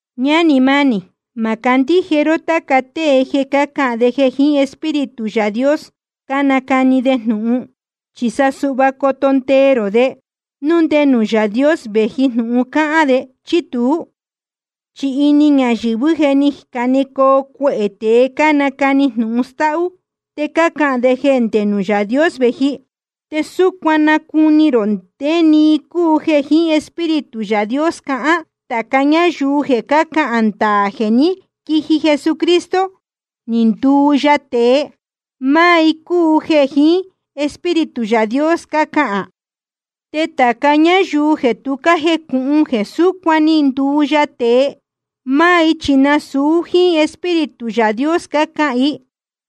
Ñánī mánī, ma candíje ró táca tée jéē cácahān de jeē jiín Espíritu Yaā Dios cánacani de jnūhun. Chi sa suhva coto ndee rō de, núu nde nuū Yaā Dios vēji jnūhun cácahān de, chí tuú. Chi ini ñayɨ̄vɨ́ je ni canecoo cuehē tēe cánacani jnūhun stáhú, te cácahān de jeē ndé nuū Yaā Dios vēji. Te súcuan nacuni rō ndé‑ni i cúu jeē jiín Espíritu Yaā Dios cahán: tāca ñáyuu jeē cácahān ndaā jeē ní quiji Jesucristo, ni nduu ya tēe, máá i cúu jeē jiín Espíritu Yaā Dios cácahān. Te tāca ñáyuu jeē tu cájejnúhún jeē súcuan ni nduu ya tēe, máá i chi nasūu jíín Espíritu Yaā Dios cácahān i.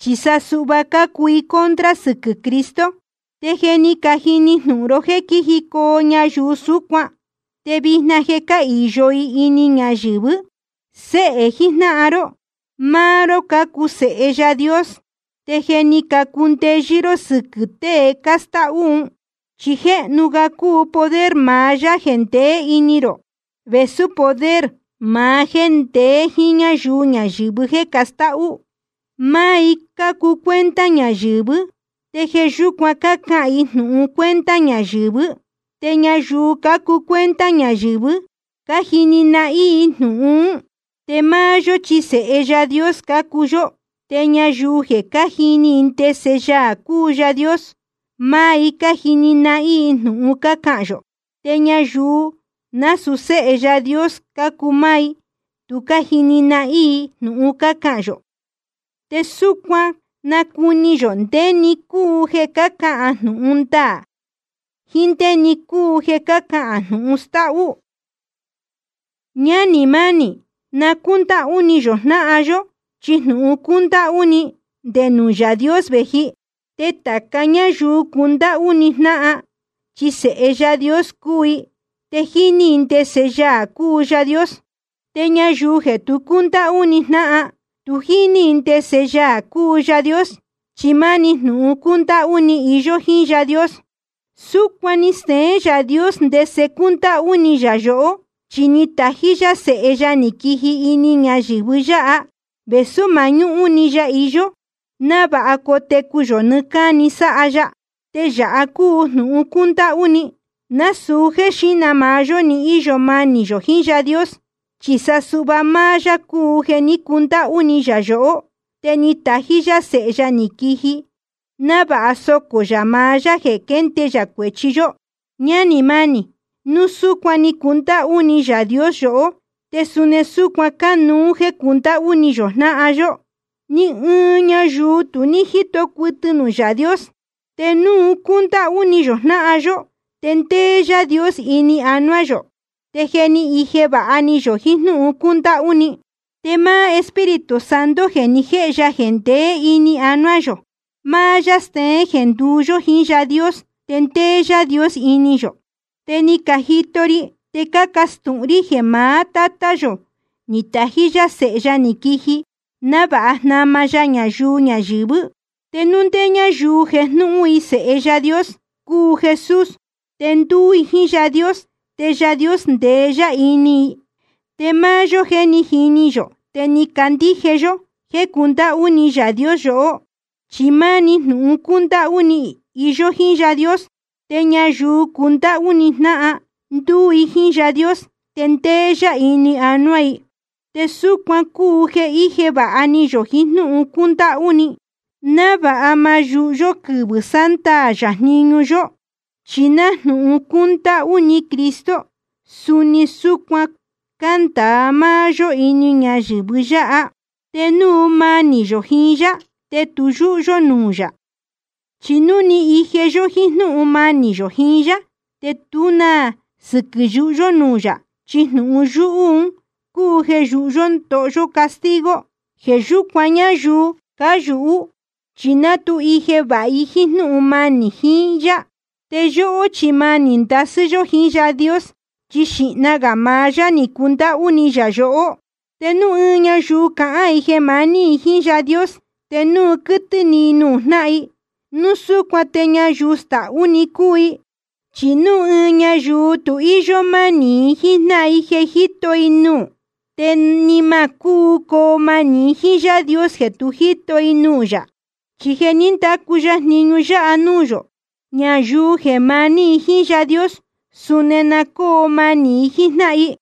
Chi sa suhva cácuu i contra sɨquɨ̄ Cristo. Te je ni cajini jnūhun ró jéē quíjicoo ñayuu súcuan, te vijna je cáhīyo i ini ñayɨ̄vɨ́. Séhē jijnáhan ró, máá ró cácuu sēhe Yaā Dios, te je ni cacundeyɨ́ ró sɨquɨ̄ tée cástáhú un. Chi jéhnu ga cúu poder maá Yaā jeē ndeé ini rō, vēsú poder maá jéē ndeé jíín ñáyuu ñayɨ̄vɨ jéē castáhú. Máá i cácuu cuenta ñayɨ̄vɨ́, te jeē yúcuan cácahān i jnūhun cuenta ñayɨ̄vɨ́. Te ñayuu cácuu cuenta ñayɨ̄vɨ́, cájini nahín i jnūhun ún. Te máá yó chi sēhe Yaā Dios cácuu yó. Te ñayuu jeē cájini i ndese Yaā cúu Yaā Dios, máá i cájini nahín i jnūhun cácahān yō. Te ñayuu jeē násūu séhe Yaā Dios cácuu, máá i tu cájini nahín i jnūhun cácahān yō. Te súcuan nacuni yō ndé‑ni cúu jeē cahán jnūhun ndaā jiín ndé‑ni cúu jeē cahán jnūhun stáhú. Ñánī mánī, na cúndáhú ni yō jnáhan yó, chi jnūhun cúndáhú ni, nde nuū Yaā Dios vēji. Te tāca ñáyuu cundáhú ni jnáhan, chi sēhe Yaā Dios cúu i, te jíní i ndese Yaā cúu Yaā Dios. Te ñayuu jeē tu cúndáhú ni jnáhan, tu jíní i ndese Yaā cúu Yaā Dios, chi máni jnūhun cúndáhú ni iyó jíín Yaā Dios. Súcuan ni steén Yaā Dios ndese cúndáhú ni yā yohó, chi ni tají yá Sēhe ya ni quiji ini ñayɨ̄vɨ yáha, vēsú mañúhún‑ni ya iyó, návāha cotecu yō nɨɨ́ cáni sáha ya. Te yāha cúu jnūhun cúndáhú ni: nasūu jéē xíhna maá yó ni íyo manī yō jiín Yaā Dios, chi sa suhva máá yá cúu jeē ní cundáhú ni yā yohó. Te ni tají yá Sēhe ya ni quiji, návāha socō yā maá yá jeē quende yā cuēchi yó. Ñánī mánī, núu súcuan ni cundáhú ni Yaā Dios yohó, te suni súcuan cánuú jeē cundáhú ni yō jnáhan yó. Ni ɨɨn ñayuu tu ní jíto cuɨtɨ nuū Yaā Dios. Te núu cúndáhú ni yō jnáhan yó, te ndéé Yaā Dios ini anuá yō, te je ni ije vāha ni yō jiín jnúhun cúndáhú ni. Te máá Espíritu Santo jeē ni jéhe ya jeē ndeé ini yō, máá yá steén jeē nduú yó jiín Yaā Dios, te ndéé Yaā Dios ini yō. Te ni cajito ri te cácastūhun rí jeē maá Tátá yō ni tají yá Sēhe ya ni quiji návāha jnama ya ñayuu ñayɨ̄vɨ́. Te núu ndé ñáyuu jejnúhún i jeē Séhe Yaā Dios cúu Jesús, te ndúú i jíín Yaā Dios, te Yaā Dios ndeé yá ini i. Te máá yó, je ni jini yō te ni candíje yó jéē cundáhú ni Yaā Dios yohó. Chi máni jnūhun cúndáhú ni iyó jíín Yaā Dios. Te ñayuu cundáhú ni jnáhan, ndúú i jíín Yaā Dios, te ndéé yá ini anuá i. Te súcuan cúu jeē íje vāha ni yō jiín jnúhun cúndáhú ni, návāha ma yūhu yó quɨvɨ̄ sándaā yā jniñu yó. Chi nájnūhun cúndáhú ni Cristo, suni súcuan cándāa máá yó ini ñayɨ̄vɨ yáha. Te núu manī yō jiín yá, te tu yúhú yó nuū yā. Chi núu ni ije yó jíín jnúhun manī yō jiín yá, te tú na sɨquɨ̄ yuhú yó nuū yā. Chi jnūhun yúhú un cúu jeē yuhú yó ndoho yó castigo. Jeē yúcuan ñayuu cáyūhú chi ná tu ije vāha i jíín jnúhun manī i jíín yá. Te yóhó chi manī ndasɨ́ yó jiín Yaā Dios, chi xīhna gā maá yá ni cundáhú ni yā yohó. Te núu ɨɨn ñayuu cahán i jeē maní i jíín Yaā Dios, te núu quɨ́tɨ́ ni i nuū jnáhan i, núu súcuan te ñayuu stahú‑ni cúu i. Chi núu ɨɨn ñayuu tu íyó mánī i jíín jnáhan i jeē jíto i nuū, te ni ma cúu coo manī i jíín Yaā Dios jeē tu jíto i nuū yā. Chi je ni ndacu ya jniñu yáha nuū yō: Ñayuu jeē maní i jíín Yaā Dios, suni na cóo manī i jíín jnáhan i.